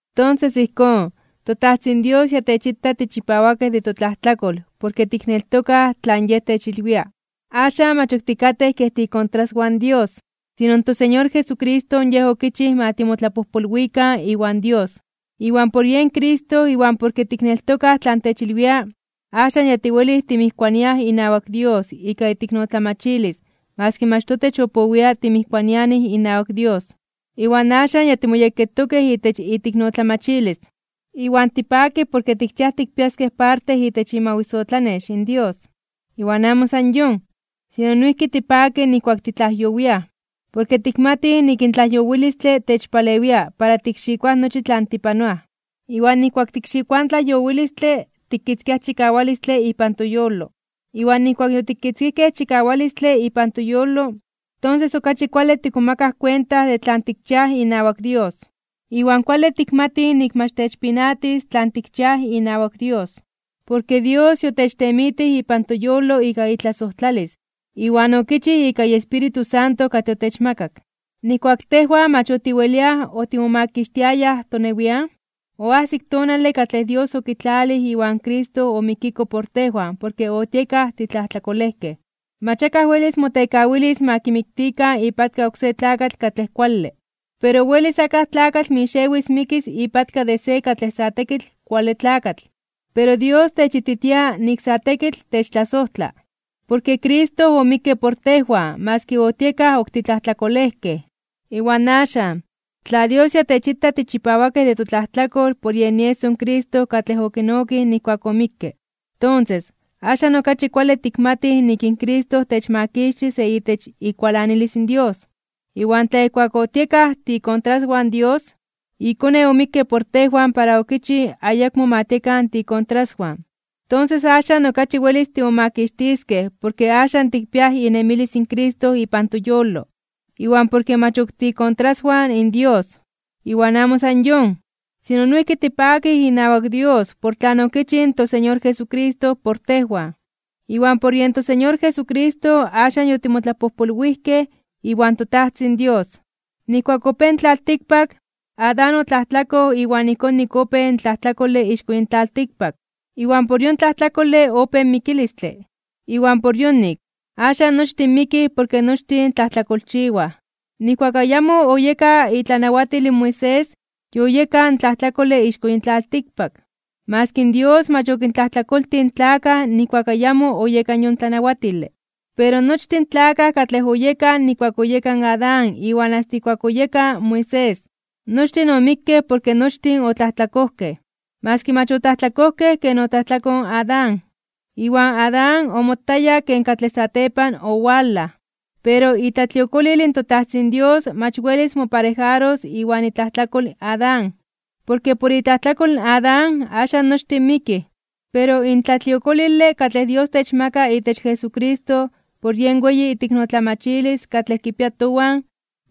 Tonses ijkón, in toTajtzin Dios ya techita tichipawakej de totlajtlakol porke tikneltokaj tlan Yej techilwia. Axan, mach ok tikatej kej tiikontraswan in Dios, sino in toSeñor Jesucristo Yej okichij ma timotlapojpolwikan iwan Dios. Iwan por yen Cristo iwan porke tikneltokaj tlan techilwia, axan tiwelij timijkuaniaj inawak Dios ika iteiknotlamachilis maski mach totech opowia timijkuanianij inawak, iwan axan ya timoyekketokej itech iteiknotlamachilis. Iwan tipakij porke tikchiaj tikpiaskej parte itech imawisotlanex in Dios. Iwan amo san yon, sino noijki tipakij nijkuak titlajyowiaj, porke tikmatij nik in tlajyowilistle techpalewia para tikxikoaj nochi tlan tipanoaj. Iwan nijkuak tikxikoaj in tlajyowilistle, tikitzkiaj chikawalistle ipan toyolo. Iwan nijkuak yotikitzkijkej chikawalistle ipan toyolo, tonses, okachi kuale tikmomakaj kuenta de tlan tikchiaj inawak Dios. Iwan kuale tikmatij nik mach techpinatis tlan tikchiaj inawak Dios. Porke Dios yotechtemitij ipan toyolo ika itlasojtlalis iwan okichij ika iEspíritu Santo katlej otechmakak. Nijkuak tejwan mach otiweliaj otimomakixtiayaj tonewian, oajsik tonale katlej Dios okitlalij iwan Cristo omikiko por tejwan porke otiekaj titlajtlakolejkej. Mach akaj welis motekawilis ma kimiktikan ipatka oksé tlakatl katlej kuale. Pero welis akaj tlakatl mixewis mikis ipatka de se katlej sa tekitl kuale tlakatl. Pero Dios techititia nik sa tekitl techtlasojtla, porke Cristo omikke por tejwan maski otiekaj ok titlajtlakolejkej. Iwan axan, tla Dios ya techita tichipawakej de totlajtlakol por yen ieso in Cristo katlej okinokij nijkuak omikke, tonses, axan okachi kuale tikmatij nik in Cristo techmakixtis de itech ikualanilis in Dios. Iwan tla ijkuak otiekaj tiikontraswan in Dios, iKone omikke por tejwan para okichij ayakmo ma tiekan tiikontraswan, tonses axan okachi welis timomakixtiskej porke axan tikpiaj inemilis in Cristo ipan toyolo, iwan porke mach ok tiikontraswan in Dios. Iwan amo san yon, sino noijki tipakij inawak Dios por tlan okichij in toSeñor Jesucristo por tejwan, iwan por yen toSeñor Jesucristo axan yotimotlapojpolwijkej iwan toTajtzin Dios. Nijkuak opéj in tlaltikpak Adán otlajtlakoj iwan ijkón nik opéj in tlajtlakole ixko yin tlaltikpak, iwan por yon tlajtlakole opéj in mikilistle. Iwan por yonik, axan nochtin mikij porke nochtin tlajtlakolchiwaj. Nijkuak ayamo oyeka itlanawatil in Moisés, yoyeka in tlajtlakole ixko yin tlaltikpak, maski in Dios mach okintlajtlakoltij in tlakaj nijkuak ayamo oyeka yon tlanawatile. Pero, nochtin in tlakaj katlej oyekaj nijkuak oyeka in Adán iwan asta ijkuak oyeka in Moisés, nochtin omikkej porke nochtin otlajtlakojkej, maski mach otlajtlakojkej ken otlajtlakoj in Adán. Iwan Adán omotaya ken katlej satepan owalaj. Pero itlatliokolil in toTajtzin Dios mach welis moparejaros iwan itlajtlakol in Adán. Porke por itlajtlakol in Adán, axan nochtin mikij. Pero in tlatliokolile katlej Dios techmaka itech Jesucristo por yen weyi iteiknotlamachilis katlej kipia towan,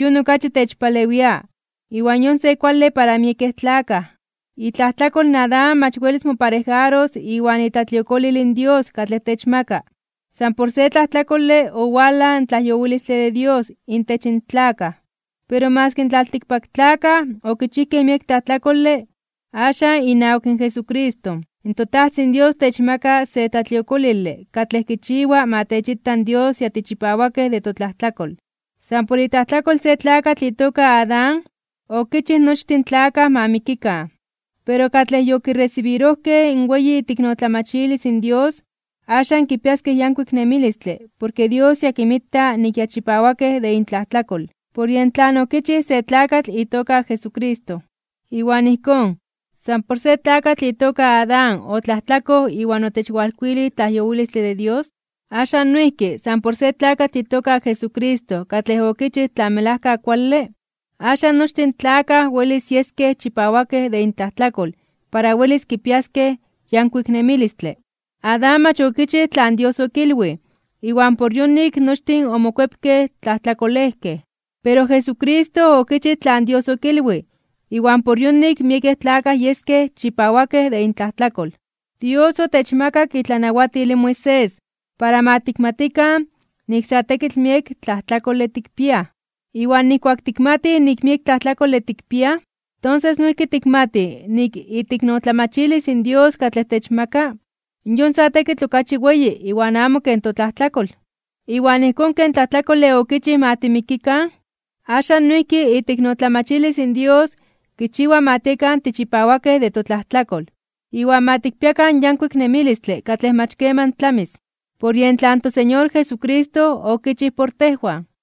yon okachi techpalewia iwan yon se kuale para miekej tlakaj. Itlajtlakol in Adán mach welis moparejaros iwan itlatliokolil in Dios katlej techmaka. San por se tlajtlakole, owalaj in tlajyowilistle de Dios intech in tlakaj. Pero maski in tlaltikpaktlakaj okichijkej miek tlajtlakole, axan inawak Jesucristo in toTajtzin Dios techmaka se tlatliokolile katlej kichiwa ma techita in Dios ya tichipawakej de totlajtlakol. San por itlajtlakol se tlakatl itoka Adán, okichij nochtin in tlakaj ma mikikan. Pero katlej yokiresibirojkej in weyi iteiknotlamachilis in Dios, axan kipiaskej yankuik nemilistle porke Dios ya kinmita nik ya chipawakej de intlajtlakol, por yen tlan okichij se tlakatl itoka Jesucristo. Iwan ijkón, san por se tlakatl itoka Adán otlajtlakoj iwan otechwalkuilij tlajyowilistle de Dios, axan noijki san por se tlakatl itoka Jesucristo katlej okichij tlan melajka kuale, axan nochtin in tlakaj welis yeskej chipawakej de intlajtlakol para welis kipiaskej yankuik nemilistle. Adán mach okichij tlan Dios okilwij iwan por yonik nochtin omokuepkej tlajtlakolejkej. Pero Jesucristo okichij tlan Dios okilwij iwan por yonik miekej tlakaj yeskej chipawakej de intlajtlakol. Dios otechmakak itlanawatil in Moisés para ma tikmatikan nik sa tekitl miek tlajtlakole tikpiaj. Iwan nijkuak tikmatij nik miek tlajtlakole tikpiaj, tonses noijki tikmatij nik iteiknotlamachilis in Dios katlej techmaka, yon sa tekitl okachi weyi iwan amo ken totlajtlakol. Iwan ijkón ken tlajtlakole okichij ma timikikan, axan noijki iteiknotlamachilis in Dios kichiwa ma tiekan tichipawakej de totlajtlakol iwan ma tikpiakan yankuik nemilistle katlej mach keman tlamis, por yen tlan toSeñor Jesucristo okichij por tejwan.